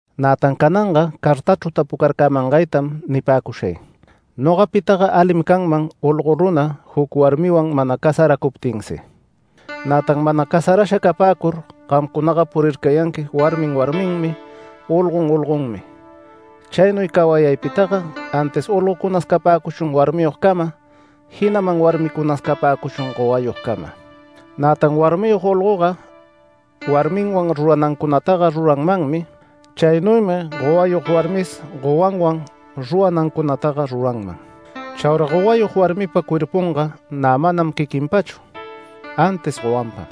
Nätan cananga cartachru tapucarcämangaytam nipäcushay: Nogapitaga alim canman olgo runa juc warmiwan mana casaracuptinsi. Nätan mana casarasha capäcur gamcunaga purircayanqui warmin warminmi, olgon olgonmi. Chaynuy cawayaypitaga antis olgocunas capäcuchun warmiyogcama, jinaman warmicunas capäcuchun gowayogcama. Nätan warmiyog olgoga warminwan ruranancunataga ruranmanmi. Chaynuymi gowayog warmis gowanwan ruranancunataga ruranman. Chaura gowayog warmipa cuerpunga nä manam quiquinpachu, antis gowanpam.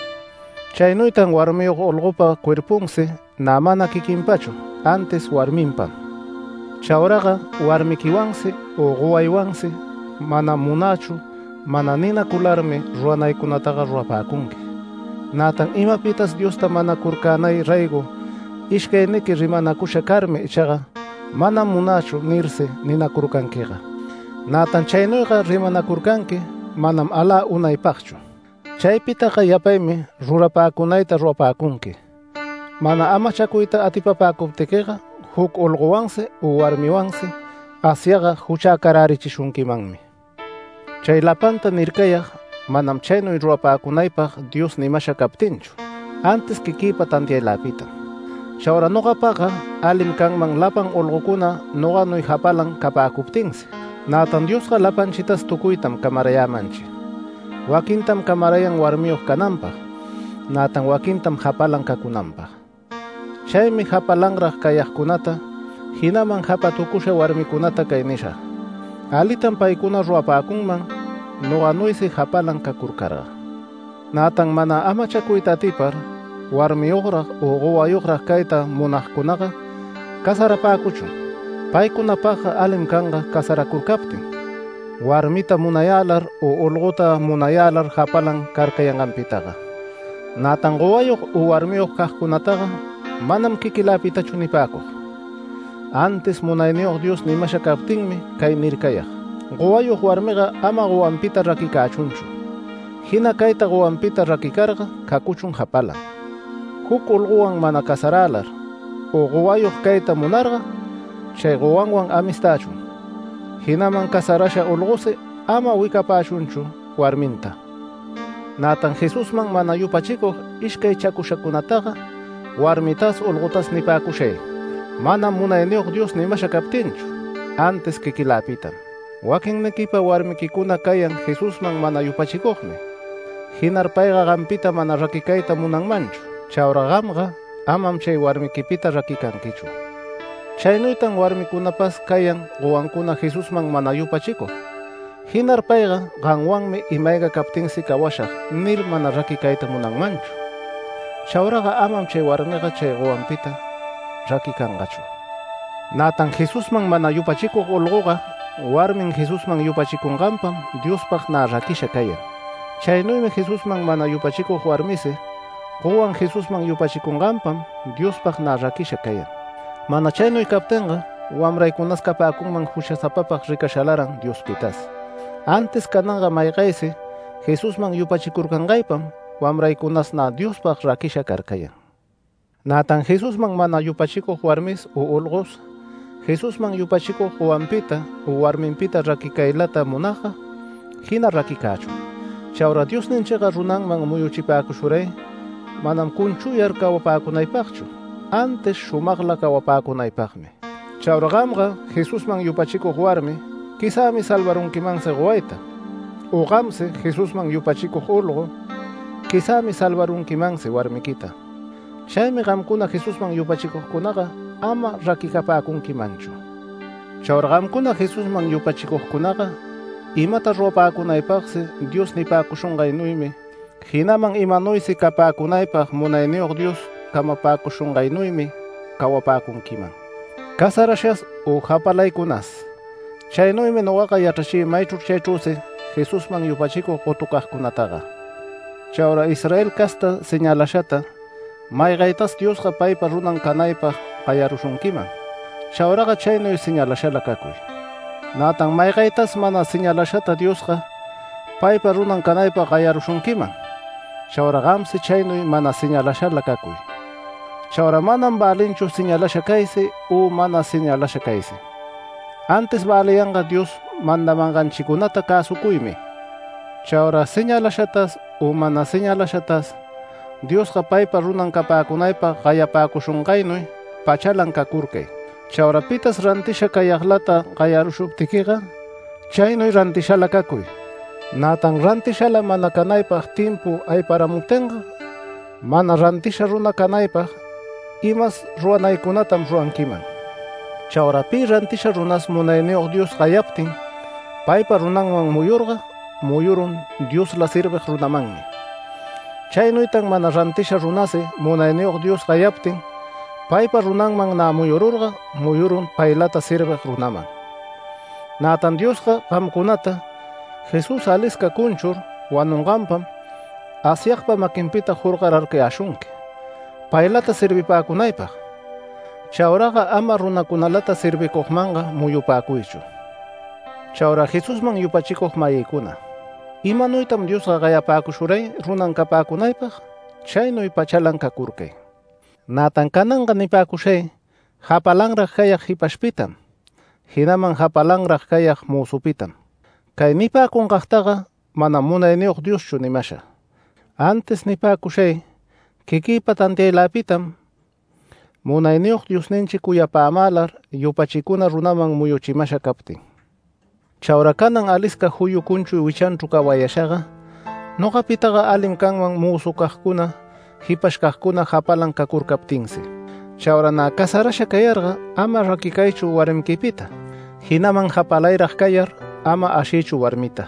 Chaynuytan warmiyog olgopa cuerpunsi nä mana quiquinpachu antis warminpam. Chauraga warmiquiwansi u gowaywansi “Manam munächu” mana ninacularmi ruranaycunacagtaga rurapäcunqui. Nätan imapitas Diosta manacurcänay raygo ishcayniqui rimanacusha carmi ichaga “Manam munächu” nirsi ninacurcanquiga, nätan chaynuyga rimanacurcanqui manam alä unaypagchu. Chaypitaga yapaymi rurapäcunayta rurapäcunqui. Mana amachacuyta atipapäcuptiquiga juc olgowansi u warmiwansi Asyagga juchäcarärichishunquimanmi. Chay lapanta nircayag manam chaynuy rurapäcunaypag Dios nimasha captinchu, antis quiquïpa tantiayläpitam Chaura nogapagga alim canman lapan olgocuna noganuy japalan capäcuptinsi, nätan Diosga lapanchitas tucuytam camarayämanchi, waquintam camarayan warmiyog cananpag, nätan waquintam japalan cacunanpag. Chaymi japalanrag cayagcunata, jinaman japatucusha warmicunata cay nishag: Alitam paycuna rurapäcunman noganuysi japalan cacurcarga. Nätan mana amachacuyta atipar warmiyograg u gowayograg cayta munagcunaga casarapäcuchun. Paycunapagga alim canga casaracurcaptin warmita munayälar u olgota munayälar japalan carcayanganpitaga. Nätan gowayog u warmiyog cagcunataga manam quiquiläpitachu nipäcug, antis Munayniyog Dios nimasha captinmi cay nircayag: Gowayog warmiga ama gowanpita raquicächunchu. Jina cayta gowanpita raquicarga cacuchun japalan, juc olgowan mana casarälar u gowayog cayta munarga chay gowanwan amistächun, jinaman casarasha olgosi ama wicapächunchu warminta. Nätan Jesusman mana yupachicug ishcaychashacunataga warmitas olgotas nipäcushay, manam Munayniyog Dios nimasha captinchu, antis quiquïlapitam: Waquinniquipa warmiquicuna cayan Jesusman mana yupachicugmi, jinar payga gampita mana raquicayta munanmanchu, chaura gamga amam chay warmiquipita raquicanquichu. Chaynuytan warmicunapas cayan gowancuna Jesusman mana yupachicug, jinar payga “Gamwanmi ima-ayga captinsi cawashag” nir mana raquicayta munanmanchu. Chauraga amam chay warmiga chay gowanpita raquicangachu. Nätan Jesusman mana yupachicug olgoga, warmin Jesusman yupachicunganpam Diospag nä raquisha cayan. Chaynuymi Jesusman mana yupachicug warmisi, gowan Jesusman yupachicunganpam Diospag nä raquisha cayan. Mana chaynuy captinga wamraycunas capäcunman juchasapapag ricashalaran Diospitas, antis cananga maygaysi Jesusman yupachicurcangaypam wamraycunas nä Diospag raquisha carcayan. Nätan Jesusman mana yupachicug warmis u olgos, Jesusman yupachicug gowanpita u warminpita raquicaylata munagga, jina raquicächun. Chaura Diosninchiga runanman muyuchipäcushuray manam cunchuyar cawapäcunapagchu, antis shumagla cawapäcunaypagmi. Chaura gamga Jesusman yupachicug warmi quizämi salvarunquimansi gowayta, u gamsi, Jesusman yupachicug olgo quizämi salvarunquimansi warmiquita. Chaymi gamcuna Jesusman yupachicugcunaga ama raquicapäcunquimanchu. Chaura gamcuna Jesusman yupachicugcunaga imata rurapäcunaypagsi Dios nipäcushungaynuymi, jinaman imanuysi capäcunaypag Munayniyog Dios camapäcushungaynuymi cawapäcunquiman, casarashas u japalaycunas. Chaynuymi nogaga yachrachï maychru chaychrüsi Jesusman yupachicug gotucagcunataga. Chaura Israel casta señalashata maygaytas Diosga paypa runan canaypag gayarushunquiman, chauraga chaynuy señalashala cacuy. Nätan maygaytas mana señalashata Diosga paypa runan canaypag gayarushunquiman, chauraga gamsi chaynuy mana señalashala cacuy. Chaura manam välinchu señalasha caysi u mana señalasha caysi. Antis väliyanga Dios mandamanganchicunata cäsucuymi. Chaura señalashatas u mana señalashatas Diosga paypa runan capäcunaypag gayapäcushungaynuy pachalan cacurcay. Chaura pitas rantisha cayaglata gayarushuptiquiga, chaynuy rantishala cacuy. Nätan rantishala mana canaypag timpu ayparamuptinga mana rantisha runa canaypag imas ruranaycunatam ruranquiman. Chaura pi rantisha runas Munayniyog Dios gayaptin paypa runanman muyurga, muyurun Diosla servig runamanmi. Chaynuytan mana rantisha runasi Munayniyog Dios gayaptin paypa runanman nä muyururga, muyurun paylata servig runaman. Nätan Diosga gamcunata, Jesús alisca cunchur wanunganpam Asyagpa maquinpita jorgorarcayäshunqui paylata servipäcunaypag. Chauraga ama runacunalata servicugmanga muyupäcuychu. Chaura Jesusman yupachicug-mayïcuna, imanuytan Diosga gayapäcushuray runan capäcunaypag, chaynuy pachalam cacurcay. Nätan cananga nipäcushay japalanran cayag jipashpitam, jinaman japalanrag cayag mözupitam. Cay nipäcunagtaga manam Munayniyog Dioschu nimasha, antis nipäcushay quiquïpa tantiaylapitam Munayniyog Diosninchi cuyapämälar yupachicuna runaman muyuchimasha captin. Chaura canan alisca juyu cunchuy wichanchru cawayashaga nogapitaga alim canman mözucagcuna jipashcagcuna japalan cacurcaptinsi. Chaura nä casarasha cayarga ama raquicaychu warmiquipita, jinaman japalayrag cayar ama ashiychu warmita.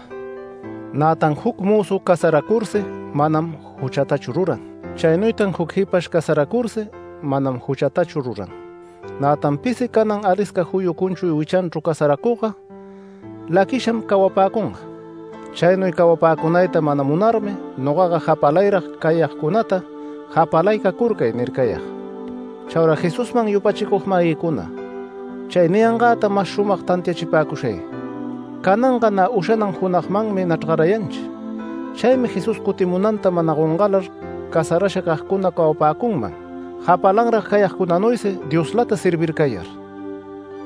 Nätan juc mözu casaracursi manam juchatachu ruran. Chaynuytan juc jipash casaracursi, manam juchatachu ruran. Nätan pisi canan alisca juyu cunchuy wichanchru casaracugga, laquisham cawapäcunga. Chaynuy cawapäcunayta mana munarmi nogaga japalayrag cayagcunata japalay cacurcay nircayag. Chaura Jesusman yupachicug-mayïcuna, chay niyangäta mas shumag tantiachipäcushay: Cananga nä ushanan junagmanmi nachrgarayanchi. Chaymi Jesús cutimunanta mana gongalar casarasha cagcuna cawapäcunman japalanrag cayagcunanuysi Dioslata servircayar.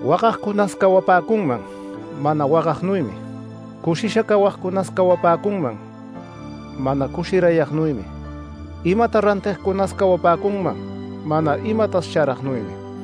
Wagagcunas cawapäcunman mana wagagnuymi. Cushisha cayagcunas cawapäcunman mana cushiragnuymi, imata rantigcunas cawapäcunman mana imatas charagnuymi.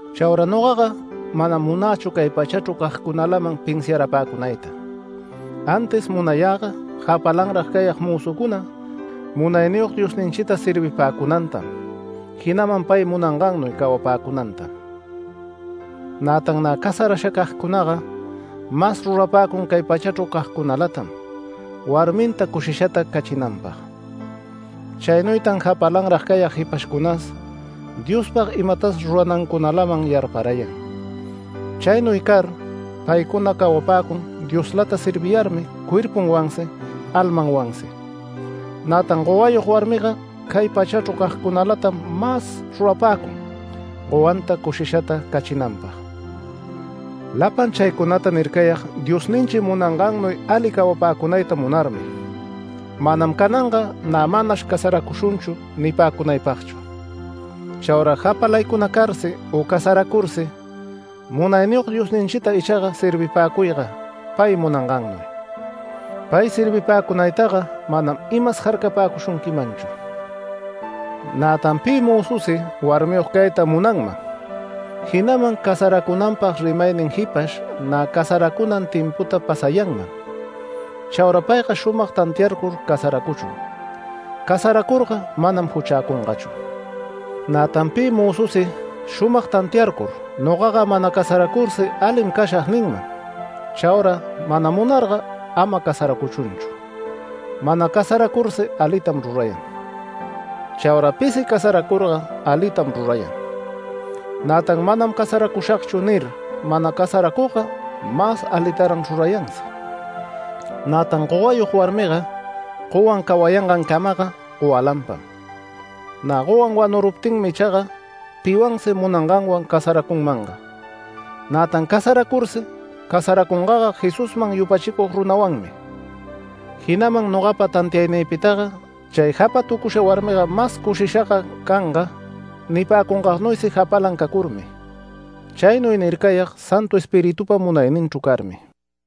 Chaura nogaga manam munächu cay pachachru cagcunalaman pinsiarapäcunayta, antis munayäga japalanrag cayag mözucuna Munayniyog Diosninchita servipäcunantam, jinaman pay munangannuy cawapäcunantam. Nätan nä casarasha cagcunaga mas rurapäcun cay pachachru cagcunalatam warminta cushishata cachinanpag. Chaynuytan japalanrag cayag jipashcunas Diospag imatas ruranancunalaman yarparayan. Chaynuy car paycuna cawapäcun Dioslata serviyarmi cuerpunwansi, almanwansi. Nätan gowayog warmiga cay pachachru cagcunalatam mas rurapäcun gowanta cushishata cachinanpag. Lapan chaycunata nircayag Diosninchi munangannuy ali cawapäcunayta munarmi, manam cananga nä “Manash casaracushunchu” nipäcunaypagchu. Chaura japalaycuna carsi u casaracursi Munayniyog Diosninchita ichaga servipäcuyga pay munangannuy. Pay servipäcunaytaga manam imas jarcapäcushunquimanchu. Nätan pi mözusi warmiyog cayta munanman, jinaman casaracunanpag rimaynin jipash nä casaracunan timputa pasayanman, chaura payga shumag tantiayur casaracuchun. Casaracurga manam juchäcungachu. Nätan pi mözusi shumag tantiarcur “Nogaga mana casaracursi alim cashag” ninman. Chaura mana munarga ama casaracuchunchu. Mana casaracursi alitam rurayan. Chaura pisi casaracurga alitam rurayan. Nätan “Manam casaräshagchu” nir mana casaracugga, mas alitaran rurayansi. Nätan gowayog warmiga, gowan cawayangancamaga gowalanpam. Nä gowan wanuruptinmi ichaga piwansi munanganwan casaracunmanga. Nätan casaracursi casaracungaga Jesusman yupachicug runawanmi. Jinaman nogapa tantiaynïpitaga chay japatucusha warmiga mas cushishaga canga nipäcungagnuysi japalan cacurmi. Chaynuy nircayag Santu Espiritupa munayninchru carmi.